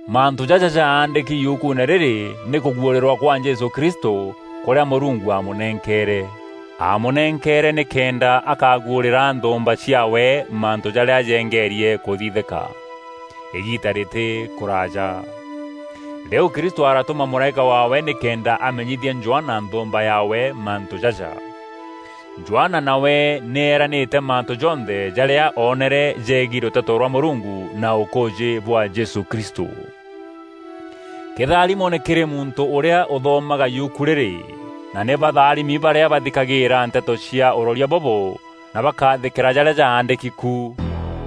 Mantû jaja jaandîki yukuune rîrî nî kûguûrîrwa kwa Jesû Kristû kûrîa Mûrungu aamûnenkeere. Aamûnenkeere nîkenda akaguûrîra nthûûmba ciaawe mantû jarîa jengeerie kûthithîka, îgiita rîtî kûraaja. Rîu Kristû aratûma mûraîka waawe nîkenda amenyithia Johana nthûûmba yaawe mantû jaja. Johana nawe nî eranîte mantû jonthe jarîa oonere jegiî rûteto rwa Mûrungu na ûkûûjî bwa Jesû Kristû. Kîtharimo nî kîrî muntû ûrîa ûthomaga yuku rîrî, na nî batharimi barîa bathikagîîra nteto cia ûroria bûbû na bakathîkîra jarîa jaandîki ku.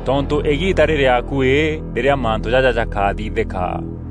Tontû îgiita rîrî akuî rîrîa mantû jaja jakathithîka.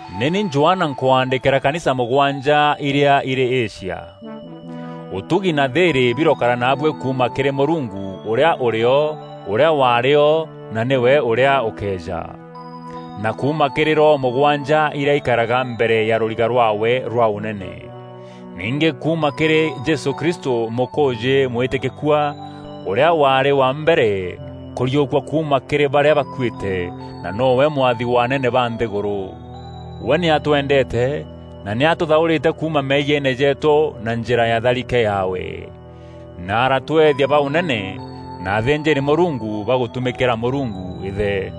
Nî ni Johana nkwaandîkîra kanisa mûgwanja irîa irî Asia. Ûtugi na thîîrî birokara naabuî kuuma kîrî Mûrungu ûrîa ûrîo na ûrîa warîo na nîwe ûrîa ûkeeja; na kuuma kîrî roho mûgwanja irîa ikaraga mbere ya rûriga rwaawe rwa ûnene, ningî kuuma kîrî Jesû Kristû, mûkûûjî mwîtîkîkua, ûrîa waarî wa mbere kûriûkua kuuma kîrî barîa bakuîte, na nowe mwathi wa anene ba nthîgûrû. We nî atwendeete na nî atûthaûrîte kuuma meeyiene jeetû na njîra ya tharike yaawe, na aratweethia ba ûnene na athînjîri-Mûrungu ba gûtumîkîra Mûrungu Îthe.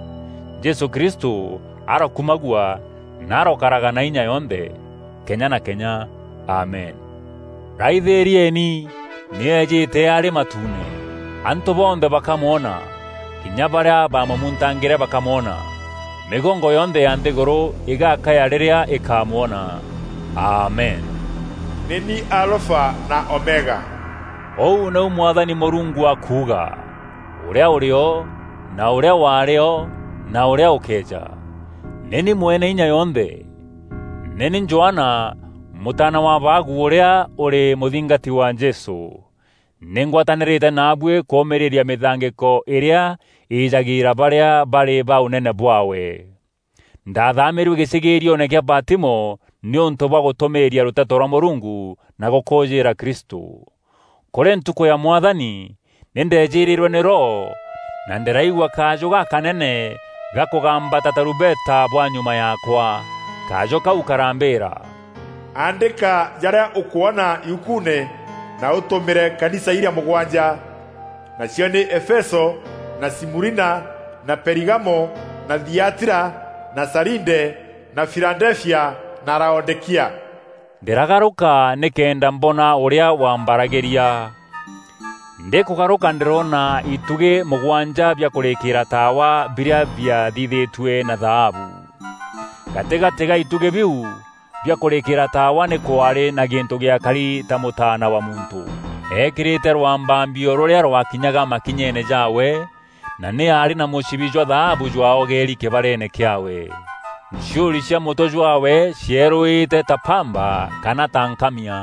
Jesû Kristû arokumagua na arokaraga na inya yonthe kenya na kenya. Amen. Raithîrieni! Nî eejîte arî matuune! Antû bonthe bakamwona, kinya barîa baamûmuntangîre bakamwona. Mîgongo yonthe ya nthîgûrû îgakaya rîrîa îkamwona. Amen. “Nî ni Alfa na Omega,” ûu nîu Mwathani Mûrungu akuuga, ûrîa ûrîo na ûrîa waarî o na ûrîa ûkeeja; nî ni Mweneinya yonthe. Nî ni Johana, mûtaana wa abaagu ûrîa ûrî mûthingati wa Jesû. Nî ngwatanîrîte naabuî kûûmîîria mîthangîko îrîa îjagîîra barîa barî ba ûnene bwaawe. Ndathaamîîrue gîcîgîrioone kîa Patimo nîûntû bwa gûtûmîîria rûteto rwa Mûrungu na gûkûûjîîra Kristû. Kûrî ntukû ya Mwathani, nî ndeejîrîrwe nî Roho na ndîraigua kajû gakanene gakûgamba ta tarumbeta bwa nyuma yaakwa. Kajû kau karambîîra, “Aandîka jarîa ûkwona yukuune na ûtûmîre kanisa irîa mûgwanja. Nacio nî Efeso na Simurina na Perigamo na Thiatira na Saride na Filadefia na Laodîkia.” Ndîragarûka nîkenda mbona ûrîa wambaragîria. Ndîkûgarûka ndîroona itugî mûgwanja bia kûrîkîîra taawa birîa biathithîtue na thaabu. Gatîgatî ga itugî biu bia kûrîkîîra taawa nî kwaarî na gîntû gîakari ta mûtaana wa muntû, eekîrîte rwambambio rûrîa rwakinyaga makinyeene jaawe, na nî aarî na mûcibi jwa thaabu jwaogeeri kîbareene kîaawe. Nciûri cia mûtwe jwaawe cierûîte ta bamba kana ta nkamia.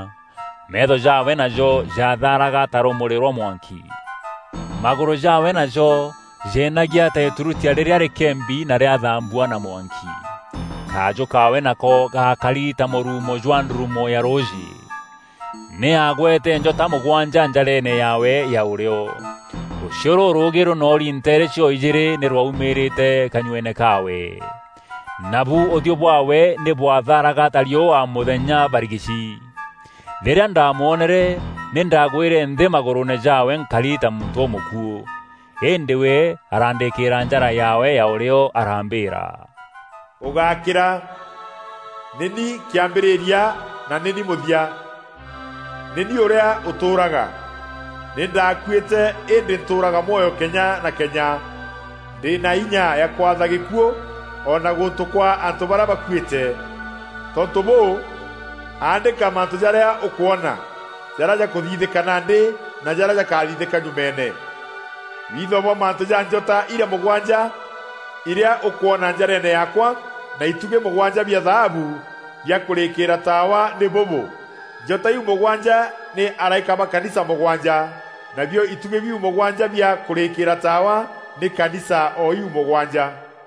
Meetho jaawe najo jathaaraga ta rûmûrî rwa mwanki. Magûrû jaawe najo jeenagia ta îtûrutia rîrîa rîkembi na rîathambua na mwanki. Kajû kaawe nako gakari ta mûruumo jwa ndurumo ya rûûjî. Nî aagwete njota mûgwanja njareene yaawe ya ûrîo. Rûchiû rûrûûgî rûnoori nteere cio-ijîîri nî rwaumîîrîte kanyueene kaawe. Nabu ûthiû bwaawe nî bwathaaraga ta riûa mûthenya barigici. Rîrîa ndamwonere, nî ndaagwîre nthî magûrûûne jaawe nkari ta muntû ûmûkuû. Îndî we arandîîkîra njara yaawe ya ûrîo arambîîra, “Ûgákîra! Nî ni kîambîrîria na nî ni mûthia. Nî ni ûrîa ûtûûraga. Nî ndaakuîte îndî ntûûraga mwoyo kenya na kenya. Ndî na inya ya kwatha gîkuû o na gûntû kwa antû barîa bakuîte. Tontû bûû, aandîka mantû jarîa ûkwona: jarîa jakûthithîka nandî na jarîa jakathithîka nyumeene. Witho bwa mantû ja njota irîa mûgwanja irîa ûkwona njareene yaakwa na itugî mûgwanja bia thaabu bia kûrîkîîra taawa nî bûbû: njota iu mûgwanja nî araîka ba kanisa mûgwanja, nabio itugî bîu mûgwanja bia kûrîkîîra taawa nî kanisa o iu mûgwanja.”